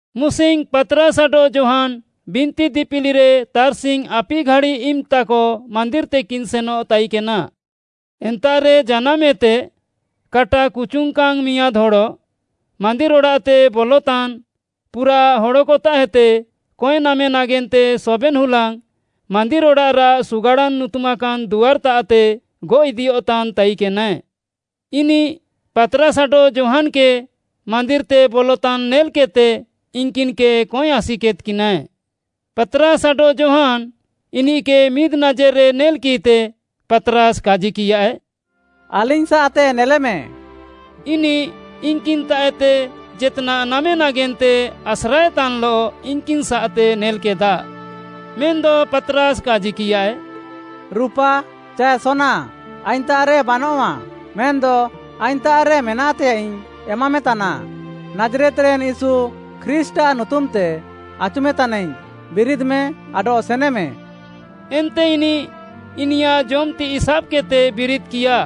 ମୁସିଙ୍ଗ୍‌ ପାତ୍‌ରାସ୍‌ ଆଡଃ ଯୋହାନ୍‌ ବିନ୍ତି ଦିପିଲିରେ ତାର୍‍ସିଙ୍ଗ୍‌ ଆପିଘାଡ଼ି ଇମ୍‌ତାକ ମାନ୍ଦିର୍‌ତେକିନ୍ ସେନଃ ତାଇକେନା। ଏନ୍ତାଃରେ ଜାନାମ୍‌ଏତେ କାଟା କୁଚୁଙ୍ଗ୍‌କାନ୍‌ ମିଆଁଦ୍‌ ହଡ଼, ମାନ୍ଦିର୍‌ ଅଡ଼ାଃତେ ବଲତାନ୍‌ ପୁରାଃ ହଡ଼କତାଃଏତେ କଏଁନାମେ ନାଗେନ୍ତେ ସବେନ୍‌ ହୁଲାଙ୍ଗ୍‌ ମାନ୍ଦିର୍‌ ଅଡ଼ାଃରାଃ ସୁଗାଡ଼ାନ୍‌ ନୁତୁମାକାନ୍‌ ଦୁଆର୍‌ତାଃତେ ଗଅଃ ଇଦିୟଃତାନ୍‌ ତାଇକେନାଏ। ଇନିଃ ପାତ୍‌ରାସ୍‌ ଆଡଃ ଯୋହାନ୍‌କେ ମାନ୍ଦିର୍‌ତେ ବଲତାନ୍ ନେଲ୍‍କେଦ୍‍ତେ ଇନ୍‌କିନ୍‌କେ କଏଁ ଆସିକେଦ୍‍କିନାଏ। ପାତ୍‌ରାସ୍‌ ଆଡଃ ଯୋହାନ୍‌ ଇନିଃକେ ମିଦ୍‌ନାଜେର୍‌ରେ ନେଲ୍‌କିଃତେ, ପାତ୍‌ରାସ୍‌ କାଜିକିୟାଏ, “ଆଲିଙ୍ଗ୍‌ସାଃତେ ନେଲେମେ।” ଇନିଃ ଇନ୍‌କିନ୍‌ତାଃଏତେ ଜେତ୍‌ନାଃ ନାମେ ନାଗେନ୍ତେ ଆସ୍ରାଏତାନ୍‍ଲଃ ଇନ୍‍କିନ୍‌ସାଃତେ ନେଲ୍‍କେଦା। ମେନ୍‌ଦ ପାତ୍‌ରାସ୍‌ କାଜିକିୟାଏ, “ରୁପା ଚାଏ ସୋନା ଆଇଙ୍ଗ୍‌ତାଃରେ ବାନଆଃ, ମେନ୍‌ଦ ଆଇଙ୍ଗ୍‌ତାଃରେ ମେନାଃତେୟାଃଇଙ୍ଗ୍‌ ଏମାମେତାନା, ନାଜ୍‌ରେତ୍‌ରେନ୍‌ ୟୀଶୁ ଖ୍ରୀଷ୍ଟ୍‌ଆଃ ନୁତୁମ୍‌ତେ ଆଚୁମେତାନାଇଙ୍ଗ୍‌ ବିରିଦ୍‌ମେ ଆଡଃ ସେନେମେ।” ଏନ୍ତେ ଇନିଃ ଇନିୟାଃ ଜମ୍‍ ତିଃଇ ସାବ୍‌କେଦ୍‌ତେ ବିରିଦ୍‌କିୟା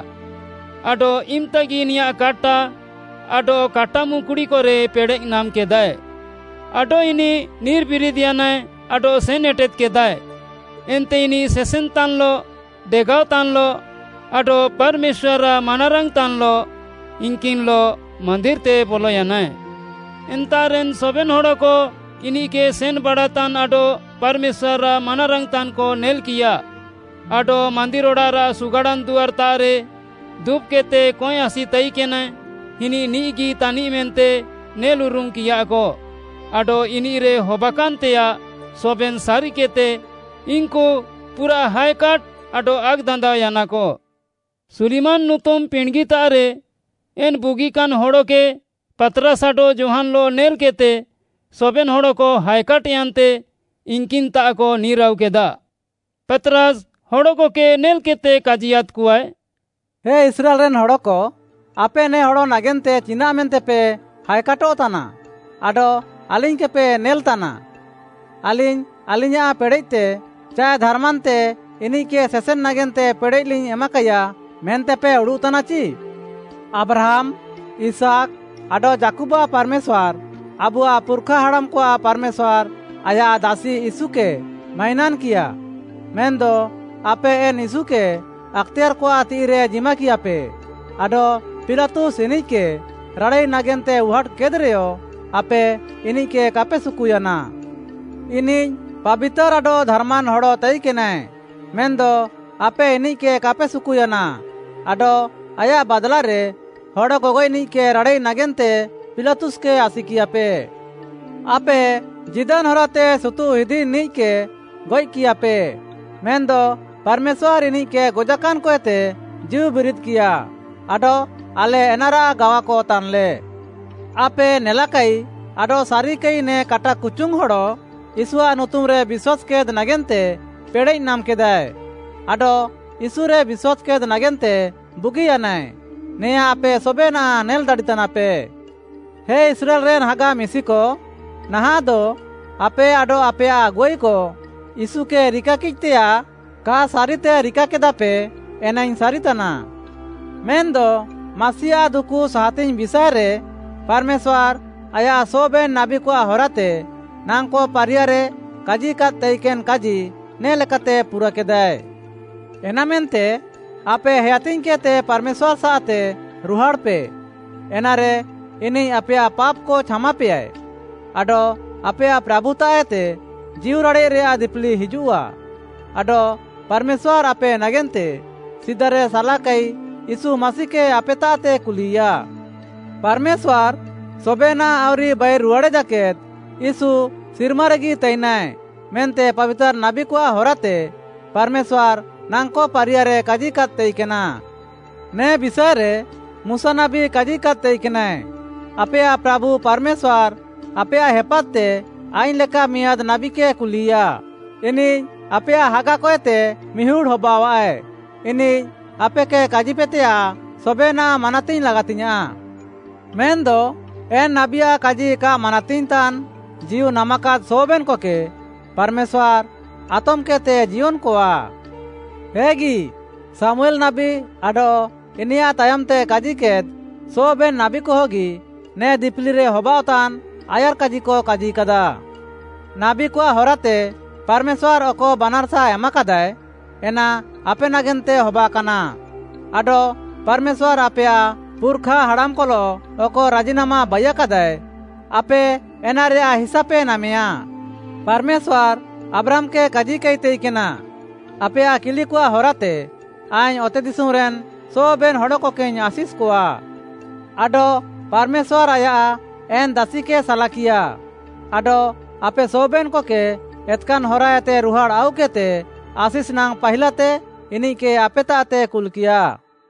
ଆଡଃ ଇମ୍‍ତାଗି ଇନିୟାଃ କାଟା ଆଡଃ କାଟାମୁକ୍‌ଣୀକରେ ପେଡ଼େଃ ନାମ୍‍କେଦାଏ। ଆଡଃ ଇନିଃ ନିର୍‌ବିରିଦ୍‍ୟାନାଏ ଆଡଃ ସେନ୍‌ ଏଟେଦ୍‌କେଦାଏ। ଏନ୍ତେ ଇନିଃ ସେସେନ୍‌ତାନ୍‌ଲଃ, ଡେଗାଅତାନ୍‌ଲଃ ଆଡଃ ପାର୍‌ମେଶ୍ୱାର୍‌ଆଃ ମାନାରାଙ୍ଗ୍‌ତାନ୍‍ଲଃ ଇନ୍‌କିନ୍‌ଲଃ ମାନ୍ଦିର୍‌ତେ ବଲୟାନାଏ। ଏନ୍ତାଃରେନ୍‌ ସବେନ୍‌ ହଡ଼କ ଇନିଃକେ ସେନ୍‍ବାଡ଼ାତାନ୍ ଆଡଃ ପାର୍‌ମେଶ୍ୱାର୍‌ଆଃ ମାନାରାଙ୍ଗ୍‌ତାନ୍‌କ ନେଲ୍‍କିୟା, ଆଡଃ ମାନ୍ଦିର୍‌ ଅଡ଼ାଃରାଃ ସୁଗାଡ଼ାନ୍‌ ଦୁଆର୍‌ତାଃରେ ଦୁବ୍‍କେଦ୍‌ତେ କଏଁ ଆସିତାଇକେନାଏ, ଇନିଃ ନିଃଗି ତାନିଃ ମେନ୍ତେ ନେଲ୍‍ଉରୁମ୍‍କିୟାକ ଆଡଃ ଇନିଃରେ ହବାକାନ୍‌ତେୟାଃ ସବେନ୍‌ ସାରିକେଦ୍‌ତେ ଇନ୍‌କୁ ପୁରାଃ ହାଏକାଟ୍‌ ଆଡଃ ଆକ୍‌ଦାନ୍ଦାଅୟାନାକ। ସୁଲିମାନ୍‌ ନୁତୁମ୍‌ ପିଣ୍ଡ୍‌ଗିତାଃରେ ଏନ୍‌ ବୁଗିକାନ୍ ହଡ଼କେ ପାତ୍‌ରାସ୍‌ ଆଡଃ ଯୋହାନ୍‌ଲଃ ନେଲ୍‌କେଦ୍‌ତେ ସବେନ୍‌ ହଡ଼କ ହାଏକାଟ୍‍ୟାନ୍ତେ ଇନ୍‍କିନ୍‌ତାଃକ ନିର୍‍ଆଉକେଦା। ପାତ୍‌ରାସ୍‌ ହଡ଼କକେ ନେଲ୍‌କେଦ୍‌ତେ କାଜିୟାଦ୍‌କଆଏ, “ହେ ଇସ୍ରାଏଲ୍‌ରେନ୍‌ ହଡ଼କ, ଆପେ ନେ ହଡ଼ ନାଗେନ୍ତେ ଚିନାଃମେନ୍ତେପେ ହାଏକାଟଃତାନା, ଆଡଃ ଆଲିଙ୍ଗ୍‌କେପେ ନେଲ୍‌ତାନା? ଆଲିଙ୍ଗ୍‌ ଆଲିଙ୍ଗ୍‌ୟାଁଃ ପେଡ଼େଃତେ ଚାଏ ଧାର୍‌ମାନ୍‌ତେ ଇନିଃକେ ସେସେନ୍‌ ନାଗେନ୍ତେ ପେଡ଼େଃଲିଙ୍ଗ୍‌ ଏମାକାଇୟା ମେନ୍ତେପେ ଉଡ଼ୁଃତାନାଚି? ଆବ୍ରାହାମ୍‌, ଇସାକ୍‌, ଆଡଃ ଯାକୁବ୍‌ଆଃ ପାର୍‌ମେଶ୍ୱାର୍‌, ଆବୁଆଃ ପୁର୍‌ଖାହାଡ଼ାମ୍‌କଆଃ ପାର୍‌ମେଶ୍ୱାର୍‌ ଆୟାଃ ଦାସି ୟୀଶୁକେ ମାଇନାନ୍‌କିୟା। ମେନ୍‌ଦ ଆପେ ଏନ୍‌ ୟୀଶୁକେ ଆକ୍‌ତେୟାର୍‌କଆଃ ତିଃଇରେ ଜିମାକିୟାପେ ଆଡଃ ପିଲାତୁସ୍‌ ଇନିଃକେ ରାଡ଼ାଇ ନାଗେନ୍ତେ ଉହାଟ୍‌କେଦ୍‌ରେୟ, ଆପେ ଇନିଃକେ କାପେ ସୁକୁୟାନା। ଇନିଃ ପାବିତାର୍‌ ଆଡଃ ଧାର୍‌ମାନ୍ ହଡ଼ ତାଇକେନାଏ, ମେନ୍‌ଦ ଆପେ ଇନିଃକେ କାପେ ସୁକୁୟାନା ଆଡଃ ଆୟାଃ ବାଦ୍‌ଲାରେ ହଡ଼ ଗଗଏଃନିଃକେ ରାଡ଼ାଇ ନାଗେନ୍ତେ ପିଲାତୁସ୍‌କେ ଆସିକିୟାପେ। ଆପେ ଜୀଦାନ୍‌ ହରାତେ ସୁତୁଃଇଦିନିଃକେ ଗଏଃକିୟାପେ, ମେନ୍‌ଦ ପାର୍‌ମେଶ୍ୱାର୍‌ ଇନିଃକେ ଗଜାକାନ୍‌କଏତେ ଜୀଉବିରିଦ୍‌କିୟା ଆଡଃ ଆଲେ ଏନାରାଃ ଗାୱାକ ତାନ୍‍ଲେ। ଆପେ ନେଲାକାଇ ଆଡଃ ସାରିକାଇ ନେ କାଟା କୁଚୁଙ୍ଗ୍‌ ହଡ଼ ୟୀଶୁଆଃ ନୁତୁମ୍‌ରେ ବିଶ୍ୱାସ୍‌କେଦ୍‌ ନାଗେନ୍ତେ ପେଡ଼େଃନାମ୍‌କେଦାଏ। ଆଡଃ ୟୀଶୁରେ ବିଶ୍ୱାସ୍‌କେଦ୍‌ ନାଗେନ୍ତେ ବୁଗିୟାନାଏ, ନେଆଁଁ ଆପେ ସବେନାଃ ନେଲ୍‌ ଦାଡ଼ିତାନାପେ। “ହେ ଇସ୍ରାଏଲ୍‌ରେନ୍‌ ହାଗା ମିଶିକ, ନାହାଃଁଦ, ଆପେ ଆଡଃ ଆପେୟାଃ ଆଗୁଆଇକ ୟୀଶୁକେ ରିକାକିଃତେୟାଃ କା ସାରିତେ ରିକାକେଦାପେ ଏନାଇଙ୍ଗ୍‌ ସାରିତାନା। ମେନ୍‌ଦ ମାସିଆଃ ଦୁକୁ ସାହାତିଙ୍ଗ୍‌ ବିଷାଏରେ ପାର୍‌ମେଶ୍ୱାର୍‌ ଆୟାଃ ସବେନ୍‌ ନାବୀକଆଃ ହରାତେ ନାଙ୍କ ପାରିୟାରେ କାଜିକାଦ୍ ତାଇକେନ୍‌ କାଜି ନେ ଲେକାତେ ପୁରାକେଦାଏ। ଏନାମେନ୍ତେ ଆପେ ହେୟାତିଙ୍ଗ୍‌କେଦ୍‌ତେ ପାର୍‌ମେଶ୍ୱାର୍‌ସାଃତେ ରୁହାଡ଼୍‌ପେ ଏନାରେ ଇନିଃ ଆପେୟାଃ ପାପ୍‌କ ଛାମାପେୟାଏ, ଆଡଃ ଆପେୟାଃ ପ୍ରାଭୁତାଃଏତେ ଜୀଉରାଡ଼େଃରେୟାଃ ଦିପିଲି ହିଜୁଃଆ, ଆଡଃ ପାର୍‌ମେଶ୍ୱାର୍‌ ଆପେ ନାଗେନ୍ତେ ସିଦାରେ ସାଲାକାଇ ୟୀଶୁ ମାସିକେ ଆପେତାଃତେ କୁଲିୟା। ପାର୍‌ମେଶ୍ୱାର୍‌ ସବେନାଃ ଆଉରି ବାଇରୁହାଡ଼େ ଜାକେଦ୍‌ ୟୀଶୁ ସିର୍ମାରେଗି ତାଇନାଏ ମେନ୍ତେ ପାବିତାର୍‌ ନାବୀକଆଃ ହରାତେ ପାର୍‌ମେଶ୍ୱାର୍‌ ନାଙ୍କ ପାରିୟାରେ କାଜିକାଦ୍‌ ତାଇକେନା। ନେ ବିଷାଏରେ ମୁଶାନାବୀ କାଜିକାଦ୍‌ ତାଇକେନାଏ, ‘ଆପେୟାଃ ପ୍ରାଭୁ ପାର୍‌ମେଶ୍ୱାର୍‌ ଆପେୟାଃ ହେପାତ୍‌ତେ ଆଇଙ୍ଗ୍‌ ଲେକା ମିଆଁଦ୍‌ ନାବୀକେ କୁଲିୟା। ଇନିଃ ଆପେୟାଃ ହାଗାକଏତେ ମିହୁଡ଼୍‌ ହବାଅଃଆଏ। ଇନିଃ ଆପେକେ କାଜିୟାପେତେୟାଃ ସବେନାଃ ମାନାତିଙ୍ଗ୍‌ ଲାଗାତିଙ୍ଗ୍‌ୟାଁଃ। ମେନ୍‌ଦ ଏନ୍‌ ନାବୀଆଃ କାଜି କା ମାନାତିଙ୍ଗ୍‌ତାନ୍‌ ଜୀଉ ନାମାକାଦ୍‌ ସବେନ୍‌କକେ ପାର୍‌ମେଶ୍ୱାର୍‌ ଆତମ୍‌କେଦ୍‌ତେ ଜିୟନ୍‌କଆ।’ ହେଗି, ଶାମୁଏଲ୍‌ ନାବୀ ଆଡଃ ଇନିୟାଃ ତାୟମ୍‌ତେ କାଜିକେଦ୍‌ ସବେନ୍‌ ନାବୀକହଗି ନେ ଦିପିଲିରେ ହବାଅଃତାନ୍‌ ଆୟାର୍‌କାଜିକ କାଜିକାଦାଃ। ନାବୀକଆଃ ହରାତେ ପାର୍‌ମେଶ୍ୱାର୍‌ ଅକ ବାନାର୍‌ସା ଏମାକାଦାଏ, ଏନା ଆପେ ନାଗେନ୍ତେ ହବାକାନା, ଆଡଃ ପାର୍‌ମେଶ୍ୱାର୍‌ ଆପେୟାଃ ପୁର୍‌ଖା ହାଡ଼ାମ୍‌କଲଃ ଅକ ରାଜିନାମା ବାଇୟାକାଦାଏ, ଆପେ ଏନାରେୟାଃ ହିସାପେ ନାମେୟା। ପାର୍‌ମେଶ୍ୱାର୍‌ ଆବ୍ରାହାମ୍‌କେ କାଜିକାଇ ତାଇକେନା, ‘ଆପେୟାଃ କିଲିକଆଃ ହରାତେ ଆଇଙ୍ଗ୍‌ ଅତେଦିଶୁମ୍‌ରେନ୍‌ ସବେନ୍‌ ହଡ଼କକେଇଙ୍ଗ୍‌ ଆଶିଷ୍‌କଆ।’ ଆଡଃ ପାର୍‌ମେଶ୍ୱାର୍‌ ଆୟାଃ ଏନ୍‌ ଦାସିକେ ସାଲାକିୟା ଆଡଃ ଆପେ ସବେନ୍‌କକେ ଏତ୍‌କାନ୍‌ ହରାଏତେ ରୁହାଡ଼୍‌ ଆଉକେଦ୍‌ତେ ଆଶିଷ୍‌ନାଙ୍ଗ୍‌ ପାହିଲାତେ ଇନିଃକେ ଆପେତାଃତେ କୁଲ୍‌କିୟା।”